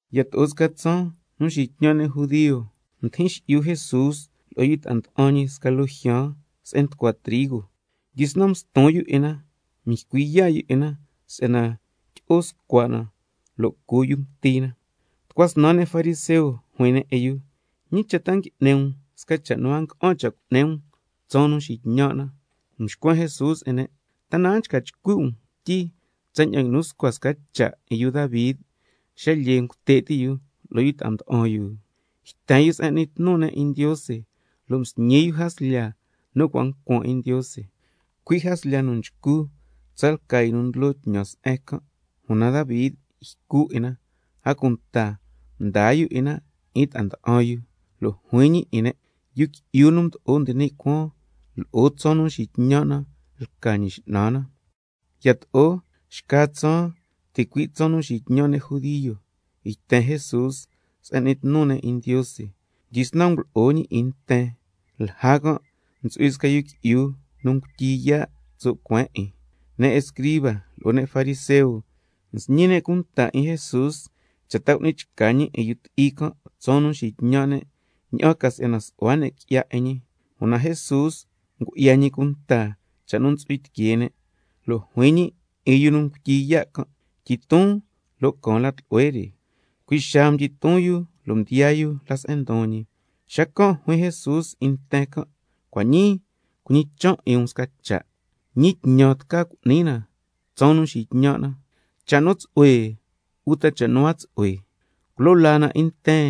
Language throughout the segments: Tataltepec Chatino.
Yato'o sca tsaan nu nxitñan' ne' judio, mdijin xi'yu Jesús lo'o yu ta'a nda'an ñi sca loo jyaan se'en nducua trigo, mdyisnan mston yu 'in na, mycui yaa' yu 'in na si'yana tyi'o scua' na lo' cu yu mti na. Tucua snan ne' fariseo juin ne' lo'o jun: ¿Ñi cha' ta ngui'ni um sca cha' nu a nga'an cha' cu'ni na tsaan nu nxitñan' na? Mxcuen Jesús 'in ne': ¿Ta na a nchca chcui' um quityi tsaña'an nguinu scua sca cha' 'in yu Davi xa lyee ngute' ti' yu lo'o ta'a mda'an yu? Yten yu se'en n'ni tnu ne' 'in Ndiose lo' msñi yu jaslya nu cua' ncuan 'in Ndiose, cui' jaslya nu nchcu tsalca yu nu ndlo tñan se'en can', una Davi ycu 'in na, a cunta mdaa yu 'in na 'in ta'a nda'an yu. Lo' juin ñi 'in ne': Yu Qui'yu nu Mdo'o nde ni' Cuaan, lo'o tsaan nu nxitñan' na lca Ñi X'nan na. Yato'o xca tsaan, ticui' tsaan nu nxitñan' ne' judio, yten Jesús se'en n'ni tnu ne' 'in Ndiose, mdyisnan ngulo'o ñi 'in nten, lja can' ntsu'hui sca yu qui'yu nu ngutyi yaa' tso' cueen 'in. Ne' escriba lo'o ne' fariseo nsñi ne' cunta 'in Jesús cha' ta cu'ni chca ñi 'in yu ti'i can' tsaan nu nxitñan' ne', ña'an ca si'yana su'hua ne' qui'ya 'in ñi. Una Jesús ngu'ya ñi cunta cha' nu ntsu'hui tiquee ne', lo' juin ñi 'in yu nu ngutyi yaa' can': Tyiton lo' caan la tlu'hue re. Cui' xaa mdyiton yu lo' mdiyaa yu la se'en ndon ñi. Xacan' juin Jesús 'in nten can': Cua' ñii cuñichan' 'in um sca cha': ¿Ñi tñan tca cu'ni na tsaan nu nxitñan' na, cha' nu tsu'hue uta cha' nu a tsu'hue? ¿Culo laa na 'in nten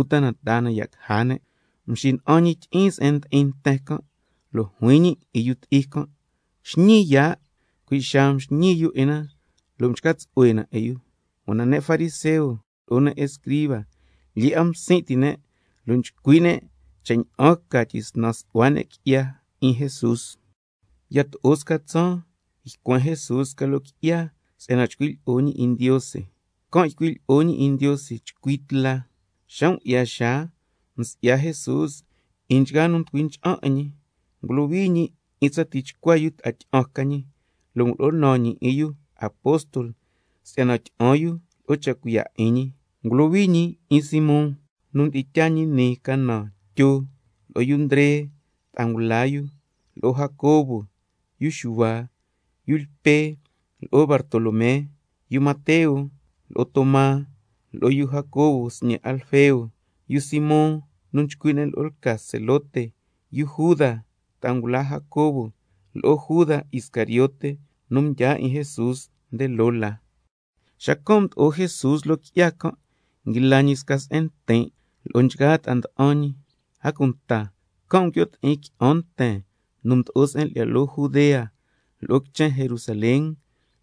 uta na taa na ya' caja ne'? Xacan' mxina'an ñi tyi'iin se'en ndi'in nten can', lo' juin ñi 'in yu ti'i can': Xñii yaa'. Cui' xaa mxñii yu 'in na lo' mchca tsu'hue na 'in yu. Una ne' fariseo lo'o ne' escriba lyee 'a msin' ti' ne', lo' nchcui' ne' cha' ña'an ca tyisnan su'hua ne' qui'ya 'in Jesús. Yato'o sca tsaan ycuen Jesús sca loo qui'ya si'yana chcui' lyi'o ñi 'in Ndiose, can' ycui' lyi'o ñi 'in Ndiose chcui tla. Xa ngu'ya xaa msi'ya Jesús 'in nchgaa nu nducui ncha'an 'in ñi, ngulohui ñi 'in tsa tichcua yu ta'a tyi'an ca ñi, lo' ngulo'o naan ñi 'in yu apóstol si'yana tyi'an yu lo'o cha' cuiya' 'in ñi. Ngulohui ñi 'in Simón, nu mdi'in tyaa ñi nii ca naan Tyo, lo'o yu Ndre ta'a ngula yu, lo'o Jacobo, yu Xuhua, yu Lpe lo'o yu Bartolomé, yu Mateo, lo'o Toma, lo'o yu Jacobo sñe' Alfeo, yu Simón nu nchcui' ne' lo'o lca Zelote, yu Juda ta'a ngula Jacobo, lo'o Juda Iscariote yu nu mdyaa 'in Jesús nde loo la. Xacan' mdo'o Jesús loo qui'ya can' nguila ñi sca se'en ntin' lo'o nchgaa ta'a nda'an ñi, a cunta can' nguio' ti'in qui'an nten nu mdo'o se'en lyi'ya loo Judea, lo'o quichen Jerusalén,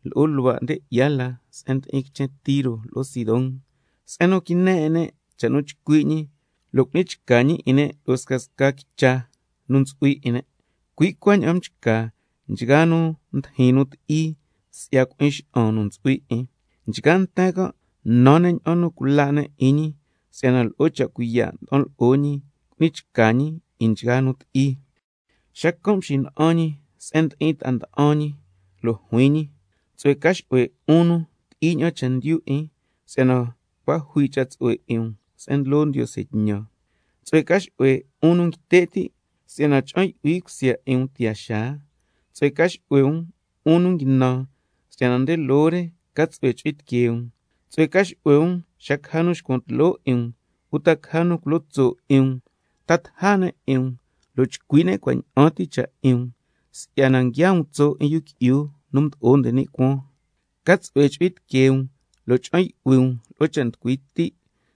lo'o luhua' nde 'ya la se'en ndi'in quichen Tiro lo'o Sidón, se'en nu quine 'in ne' cha' nu nchcui' ñi, lo' cu'ni chca ñi 'in ne' lo'o scasca quicha ntsu'hui 'in ne'. Cui' cuaña'an mchca nchgaa nu ndijin nu ti'i si'ya cui'in xa'an nu ntsu'hui 'in. Nchgaa nten can' nan ne' ña'an nu cula' ne' 'in ñi, si'yana lo'o cha' cuiya' nda'an lo'o ñi ngui'ni chca ñi 'in nchgaa nu ti'i. Xacan' mxina'an ñi se'en ndi'in ta'a nda'an ñi lo' juin ñi: Tsu'hue ca xu'hue 'un nu ti'i ña'an chendyu 'in, si'yana cua' jui cha' tsu'hue 'in um se'en ndlo Ndiose tñan. Tsu'hue ca xu'hue 'un nu nguite' ti', si'yana cha'an yu'hui cusya 'in um tiyaa xaa. Tsu'hue ca xu'hue 'un nu nguinan, si'yana nde loo la re ca tsu'hue chu'hui tiquee um. Tsu'hue ca xu'hue um xa caja nu xcuan tloo 'in um, uta caja nu culo tso' 'in um, ta taja ne' 'in um, lo' chcui' ne' cua' ña'an ti cha' 'in um, si'yana nguiaa um tso' 'in Yu Qui'yu nu Mdo'o nde ni' Cuaan. Ca tsu'hue chu'hui tiquee um lo' cha'an yu'hui um lo'o cha' nducui ti',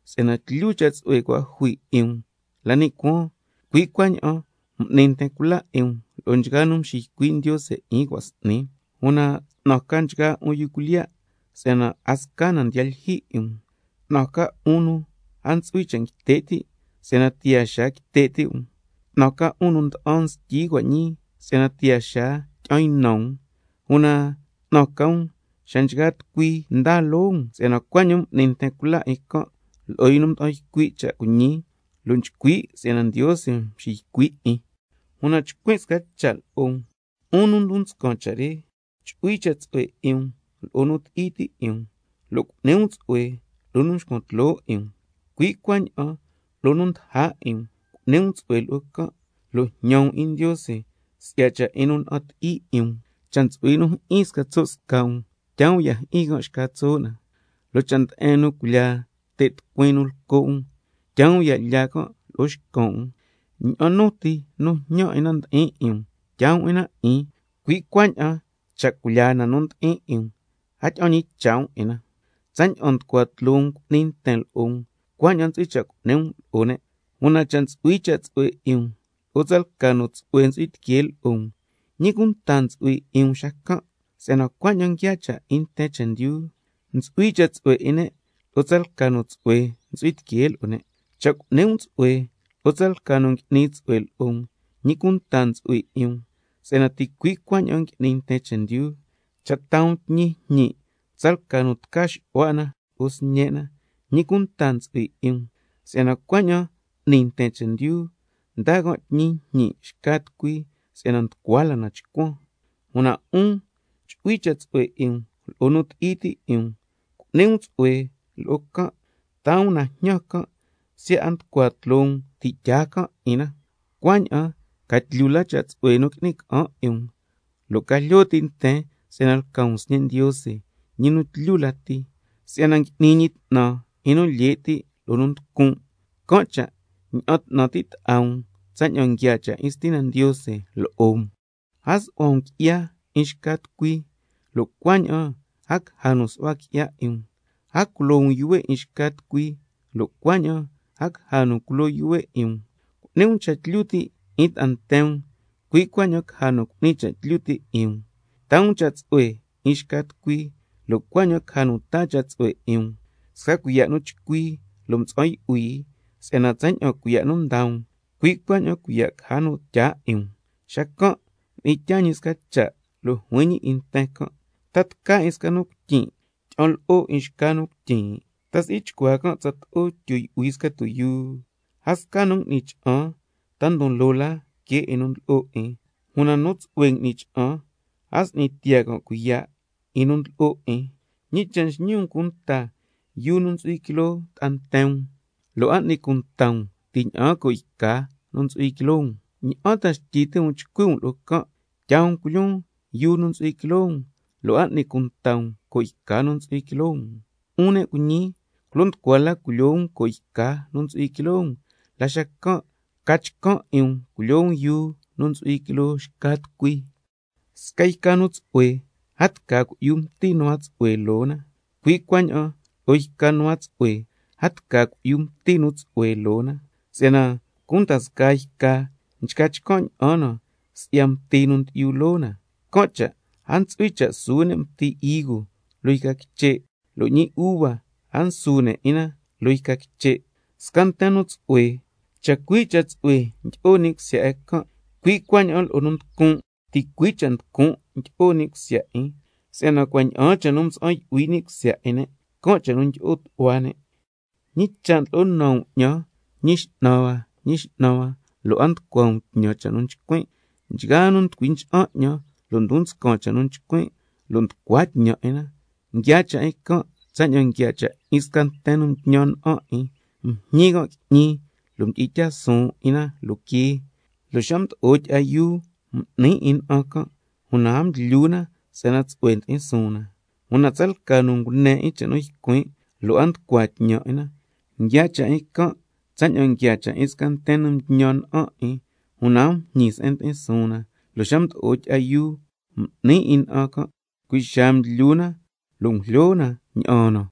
si'yana tlyu cha' tsu'hue nu cua' jui 'in um la ni' cuaan, si'yana cui' cuaña'an m'ni nten cula 'in can' lo'o nchgaa nu mxiycui' Ndiose 'in cua' s'ni. Una 'tnan ca nchgaa 'un yu cuilyiya', si'yana a sca na ndiya lyijyi 'in um. 'Tnan ca 'un nu a ntsu'hui cha' nda'an ngute' ti', si'yana tiyaa xaa quite' ti' um. 'Tnan ca 'un nu nda'an nstyi cua' ñii, si'yana tiyaa xaa tyi'an ynan um. Una 'tnan ca um xa nchgaa tucui ndaa loo um, si'yana cuaña'an m'ni nten cula 'in can' lo'o yu nu mda'an ycui' cha' cuiñi, lo' nchcui' si'yana Ndiose mxiycui' 'in. Una chcuin' sca cha' lo'o um, 'un nu ndon nscan cha' re: Chu'hui cha' tsu'hue 'in um lo'o nu ti'i ti' 'in um, lo' cu'ni um tsu'hue lo'o nu nxcuan tloo 'in um, cui' cuaña'an lo'o nu ndaja 'in um cu'ni um tsu'hue lo'o can', lo' jñan um 'in Ndiose si'ya cha' 'in nu na'an ti'i 'in um. Cha' ntsu'hui nu jyi'in sca tso' sca' um, taa um ya' jyi'in can' xca tso' na, lo' cha' nde'en nu culyaa te' tucuin nu lco' um, taa um ya' lyaa can' lo'o xcan' um. Ña'an nu ti nu jñan na ndi'in 'in um tyaa um 'in na 'in, cui' cuaña'an cha' cui'ya na nu ndi'in 'in um, a tyi'an ñicha' um 'in na. Tsaña'an nducua tloo um cu'ni nten lo'o um, cuaña'an ntsu'hui cha' cu'ni um lo'o ne'. Una cha' ntsu'hui cha' tsu'hue 'in um lo'o tsalca nu tsu'hue ntsu'hui tiquee lo'o um, ¿ñi cunta ntsu'hui 'in um xacan'? Si'yana cuaña'an nguiaa cha' 'in nten chendyu, ntsu'hui cha' tsu'hue 'in ne' lo'o tsalca nu tsu'hue ntsu'hui tiquee lo'o ne'. Cha' cu'ni um tsu'hue lo'o tsalca nu ngui'ni tsu'hue lo'o um, ¿ñi cunta ntsu'hui 'in um xacan'? Si'yana ticui' cuaña'an n'ni nten chendyu. Cha' taa um tñi jñi' tsalca nu tca xu'hua 'in na lo'o sñe' na, ¿ñi cunta ntsu'hui 'in um xacan'? Si'yana cuaña'an n'ni nten chendyu, ndaa can' tñi njñi' xca tucui si'yana nducua la na chcuan. Una 'un chu'hui cha' tsu'hue 'in um lo'o nu ti'i ti' 'in um, cu'ni um tsu'hue lo'o can', taa um na jñan can' siya' a nducua 'a tloo um ti' tyaa can' 'in na, cuaña'an ca tlyu la cha' tsu'hue nu qui'ni ca'an 'in um, lo' ca jlyo ti' nten si'yana lca um sñe' Ndiose, ñi nu tlyu lati, si'yana ngui'ni ñi 'tnan 'in nu lye' ti' lo'o nu nducun'. Can' cha' ña'an 'tnan ti' ta'a um tsaña'an nguiaa cha' 'in Stina Ndiose lo'o um. A su'hua um qui'ya 'in xca tucui, lo' cuaña'an a caja nu su'hua qui'ya 'in um. A culo um yuhue' 'in xca tucui, lo' cuaña'an a caja nu culo yuhue' 'in um. Cu'ni um cha' tlyu ti' 'in ta'a nten um, cui' cuaña'an caja nu cu'ni cha' tlyu ti' 'in um. Taa um cha' tsu'hue 'in xca tucui, lo' cuaña'an caja nu taa cha' tsu'hue 'in um, sca cuiya' nu chcui lo' mtsa'an yu'hui, si'yana tsaña'an cuiya' nu ndaa um, cui' cuaña'an cuiya' caja nu tyaa 'in um. Xacan' mdi'in tyaa ñi sca cha' lo' juin ñi 'in nten can': ¿Ta tca 'in sca nu cuityin' tyi'an lo'o 'in xca nu cuityin'? ¿Ta si'i chcuaa can' tsato'o tyu yu'hui sca tuyuu? A sca nu ngui'ni cha'an, ta ndon loo la que 'in nu ndlo'o 'in, una nchgaa tucui nu tsu'hue m'ni cha'an, a s'ni tiyaa can' cuiya' 'in nu ndlo'o 'in. ¿Ñi cha' nxñi um cunta yuu nu ntsu'hui quiloo ta'a nten um, lo' a n'ni cunta um ti' ña'aan co' yca nu ntsu'hui quiloo um? ¿Ña'an ta xtyi ti' um chcui' um lo'o can': Tyaa um culyoon yuu nu ntsu'hui quiloo um, lo' a n'ni cunta um co' yca nu ntsu'hui quiloo um? 'Un ne' cuiñi, culo nducua la culyoo um co' yca nu ntsu'hui quiloo um, la xacan' ca chcan' 'in um culyoo um yuu nu ntsu'hui quiloo xca tucui. Sca yca nu tsu'hue a tca cui'yu mti nu a tsu'hue loo na, cui' cuaña'an lo'o yca nu a tsu'hue, a tca cui'yu mti nu tsu'hue loo na. Si'yana cunda scaa yca nchca chcan' ña'an na si'ya mti nu ndyi'yu loo na, can' cha' a ntsu'hui cha' nsu ne' mti higo loo yca quiche', lo' ñi uva a nsu ne' 'in na loo yca quiche'. Sca nten nu tsu'hue, chacui' cha' tsu'hue ndyi'o ni' cusya 'in can', cui' cuaña'an lo'o nu nducun', ticui' cha' nducun' ndyi'o ni' cusya 'in, si'yana cua' ña'aan cha' nu mtsa'an yu'hui ni' cusya 'in ne', can' cha' nu ndyi'o tu'hua ne'. ¿Ñi cha' ndlo'o naan um 'ñan: Ñi X'nan hua, Ñi X'nan hua, lo' a nducua um tñan cha' nu nchcuin'? Nchgaa nu nducui ncha'an 'ñan, lo' ndon nscan cha' nu nchcuin' lo' nducua tñan 'in na, nguiaa cha' 'in can' tsaña'an nguiaa cha' 'in sca nten nu mtñan na'an 'in, mjñi can' qui'ñi lo' mdi'in tyaa suun 'in na loo quee, lo' xa mdo'o tyi'a yuu m'ni 'in na'an can', una a mdlyu na si'yana tsu'hue ndi'in suun na. Una tsalca nu ngune 'in cha' nu ycuin' lo' a nducua tñan 'in na, nguiaa cha' 'in can' tsaña'an nguiaa cha' 'in sca nten nu mtñan na'an 'in, una a mjñi se'en ndi'in suun na, lo' xa mdo'o tyi'a yuu m'ni 'in na'an can', cui' xaa mdlyu na lo' ngujlyo na ña'aan na.